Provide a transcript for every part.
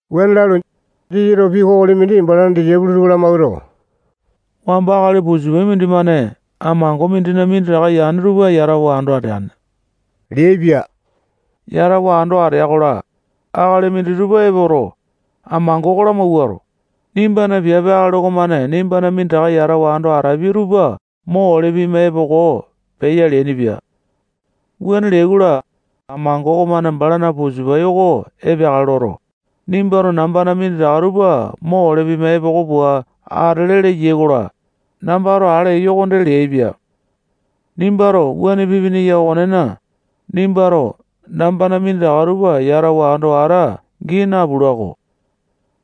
Wuane lalu, Jisasato pii kokoli mindi balana disaipolo tupa lamawuato, wamba akali pusapai mindimane amango mindina minditaka yane tupa yatawa ando ateane leaipia. Yatawa ando atea-kola, akali minditupa epoto, amango oko lamawuato, nimbana piape akali okomane nimbana minditaka yatawa ando atapia tupa mo ole pima epoko peya leainipia. Wuane leai-kola, amango okomane balana pusapai oko epeakale loto, nimbato nambana minditaka tupa mo ole pima epoko pua atele leyai-kola, nambato ale eyo okonde leaipia. Nimbato wuane pipini okonena, nimbato nambana minditaka tupa yatawa ando ata gii napula-ko.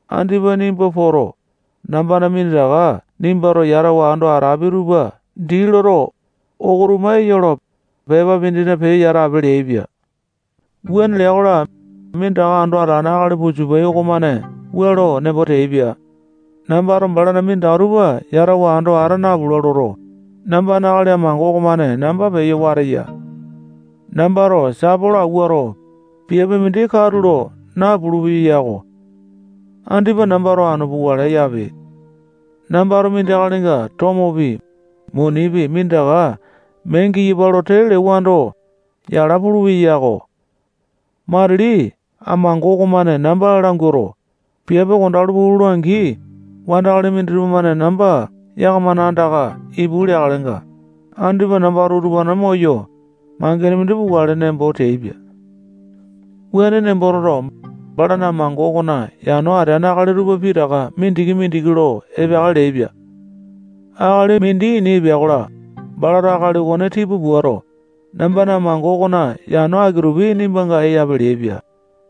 Andipa nimba poto, nambana minditaka nimbato yatawa ando atapi tupa dii loto, oko tuma eya lo, pepa mindina peyo yatape leaipia. Wuane lea-kola, minditaka ando atalane akali pusapai okomane wua lo nembo teaipia: Nambato balana minditaka tupa yatawa ando ata napula loto, nambana akali amango okomane namba peyo wateya. Nambato sapolo awuato, piape mindi katulo napulu-peyo yako. Andipa nambato anu pukale yape. Nambato mindi akalinga tomopi, munipi, minditaka mee giyapa lo tee lewando, yala pulupeya yako. Matili amango okomane namba languato, piape kondalu puu lola-angi, wandakali minditupa-mane namba yakamana andaka ipu leakalenga, andipa nambato utupane moyo, mangene mindi pukale nembo teaipia. Wuane nembo toto, balato amango okona yano atene akali tupa pitaka mindiki-mindiki lo epeakale leaipia. Akali mindi ini epea-kola, balato akali okone tipa puato, nambana amango okona yano aki-tupi nimbanga eyape leaipia.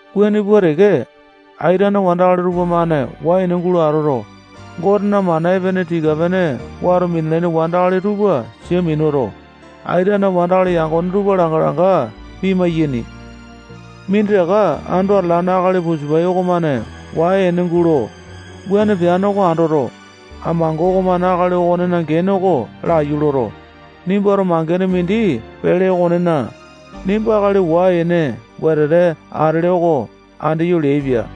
Wuane pua teke, aitene wandakali tupamane wai-ene gulo atoto, Gotena mana epene tii-pene wato minalaini wandakali tupa sia minuto, aitene wandakali yangone tupa langa-langa pimai-yaini. Minditaka ando atalane akali pusapai okomane wai ene gulo, wuane peane oko andoto, amango okomane akali okonena gene oko laiyu loto, nimbato mangene mindi pele okonena, nimba akali wai-ene wetete atele oko andeyo leaipia.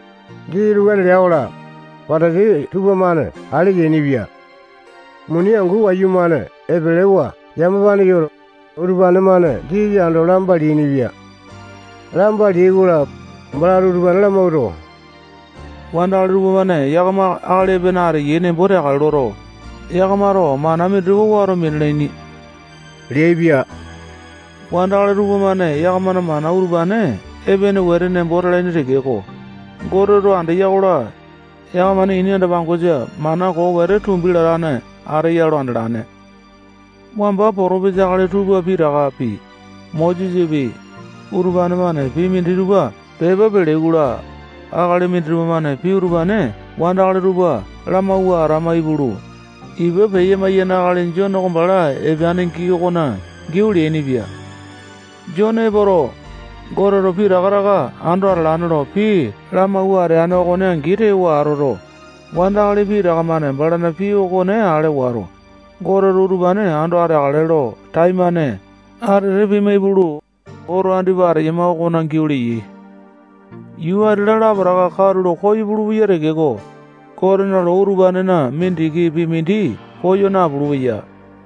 Jisasato wuane lea-kola, Patasai tupamane ale yainipia. Muni angu wayumane epelewa yamapa yoto, utupane-mane Jisasa ando lamba leainipia. Lamba leai-kola, balato utupane lamawuato, wandakali tupamane yakama akali epene ateyai nembo teakale loto, yakamato mana minditupa wato minalaini leaipia. Wandakali tupamane yakamana mana utupane epene wete nembo talaini tekeko, Goteto andeya-kola, yakamana ini anda-pangosa mana koo wete tupa tumbi latane ateya lo andalane. Wamba potopesa akali tupa pitakapi, Mosesapi, utupane-mane pii minditupa pepa peleai-kola, akali minditupa-mane pii utupane wandakali tupa lamawua atama ipulu, ipa peya-maiyane akali Jone oko bala epeane gii okona giau leainipia. Jone epoto, Goteto pitaka taka ando atalane lo pii lamawua ateane okone angi tewa atoto, wandakali pitaka-mane balana pii okone ale wato, Goteto utupane ando ateakale lo taimane atete pima ipulu, oto andipa ateyama okona giau leyai. Yuu ati-la lapotaka katulo koyo pulupeya tekeko, Gotena loo utupanena mindikipi mindi koyo napulu-peya.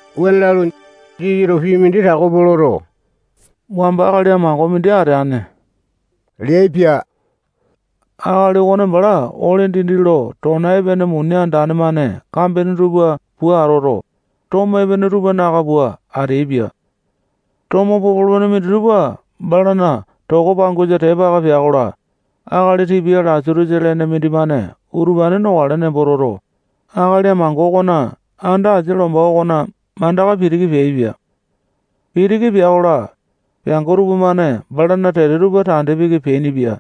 Wuane lalu, Jisasato pii mindi tako pua loto, wamba akali amango mindi ateane leaipia. Akali okone bala ole dindi lo tona epene muni andane-mane kambene tupa pua atoto, tomo epene tupa naka pua ateaipia. Tomo popolo-pene minditupa balana toko pangosa tepa aka pea-kola, akali tipia Lasatosa lene mindimane utupane nokale nembo toto, akali amango okona anda asia lomba okona mandaka pitiki peaipia. Pitiki pea-kola, peango tupamane balana tete tupa tande piki peainipia.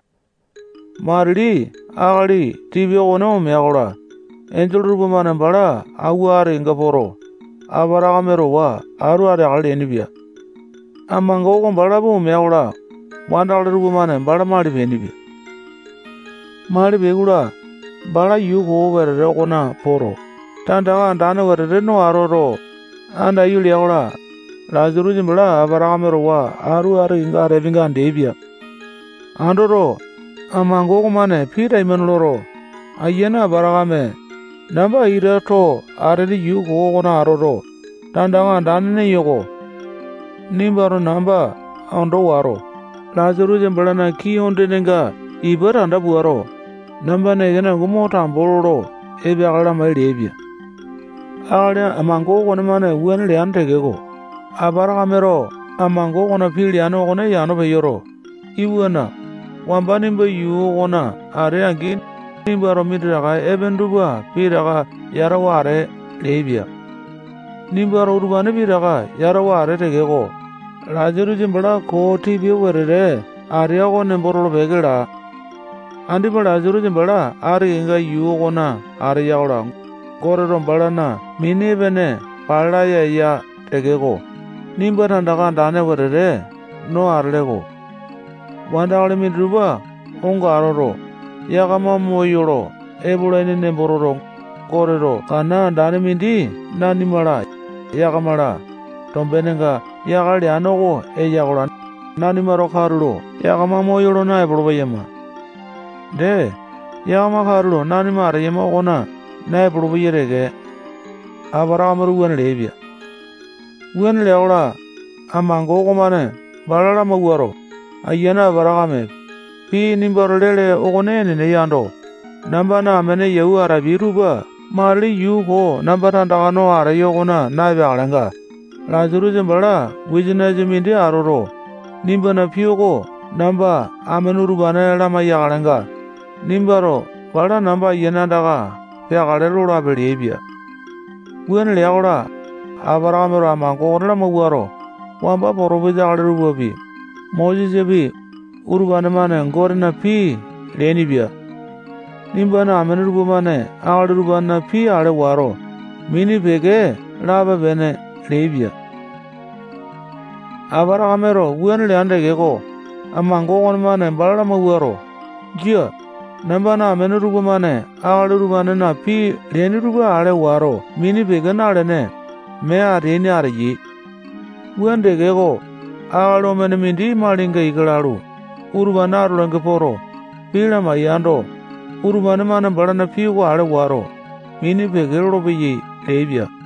Matili akali tipia okone omea-kola, enjole tupamane bala auwa ati kenga poto, Apatakame towa atu ateakale leainipia. Amango oko balapi omea-kola, wandakali tupamane bala mali peainipia. Mali peai-kola, bala yuu koo wetete okona poto, tandaka andane wetete no atoto, andaiyu lea-kola, Lasatosa bala Apatakame towa atu ati kenga ateapinga andeaipia. Andoto, amango okomane pii taimane loto, ayiane Apatakame, namba ita too atene yuu koo okona atoto, tandaka andane neyo-ko. Nimbato namba ondo wato, Lasatosa balana kii ondenenga ipa tanda puato, nambana ekene angu mo tambo lolo epeakale lamai leaipia. Akali amango okonemane wuane leane tekeko, Apatakameto amango okona pii leane okone yano peyoto, iwana, wamba nimba yuu okona atee-angi, nimbato minditaka epene tupa pitaka yatawa atee leaipia. Nimbato utupane pitaka yatawa atee tekeko, Lasatosa bala koo tipia wetete atea oko nembo tolo-peke laa. Andipa Lasatosa bala ati kenga yuu okona ateya-kola, Goteto balana mini epene pale laya eya tekeko, nimba tandaka andane wetete no atele-ko. Wandakali minditupa onga atoto, yakama moyolo epolaini nembo toto, Goteto kana andane mindi nanima-la, yakama-la, tombenenga yakale leane oko eya-kola, nanimato katulo yakama moyolo naepolo-peyama. Dee, yakama katulo nanima ateyama okona naepolo-peyai teke. Apatakameto wuane leaipia. Wuane lea-kola, amango okomane bala lamawuato, ayiane Apatakame, pii nimbato lele okone enene yando, nambana amene yau atapia tupa matili yuu koo namba tandaka no ateyo okona na-epeakalenga, Lasatosa bala wisanisa mindi atoto, nimbana pii oko namba amene utupane lamai-yakalenga, nimbato bala namba ayiane andaka peakale lolape leaipia. Wuane lea-kola, Apatakameto amango oko lamawuato, wamba potopesa akali tupapi, Mosesapi, utupane-mane Gotena pii leainipia. Nimbana amene tupamane akali utupanena pii ale wato, mini peke lape-pene leaipia. Apatakameto wuane leane tekeko, amango okonemane bala lamawuato, jia, nambana amene tupamane akali utupanena pii leaini tupa ale wato mini peke nalene, mee ateaini ateyai. Wuane tekeko, akali omene mindi malinga ika lalu, utupane atolainga poto, pii lamai-yando, utupane-mane balana pii oko ale wato, mini peke lolopeyai leaipia.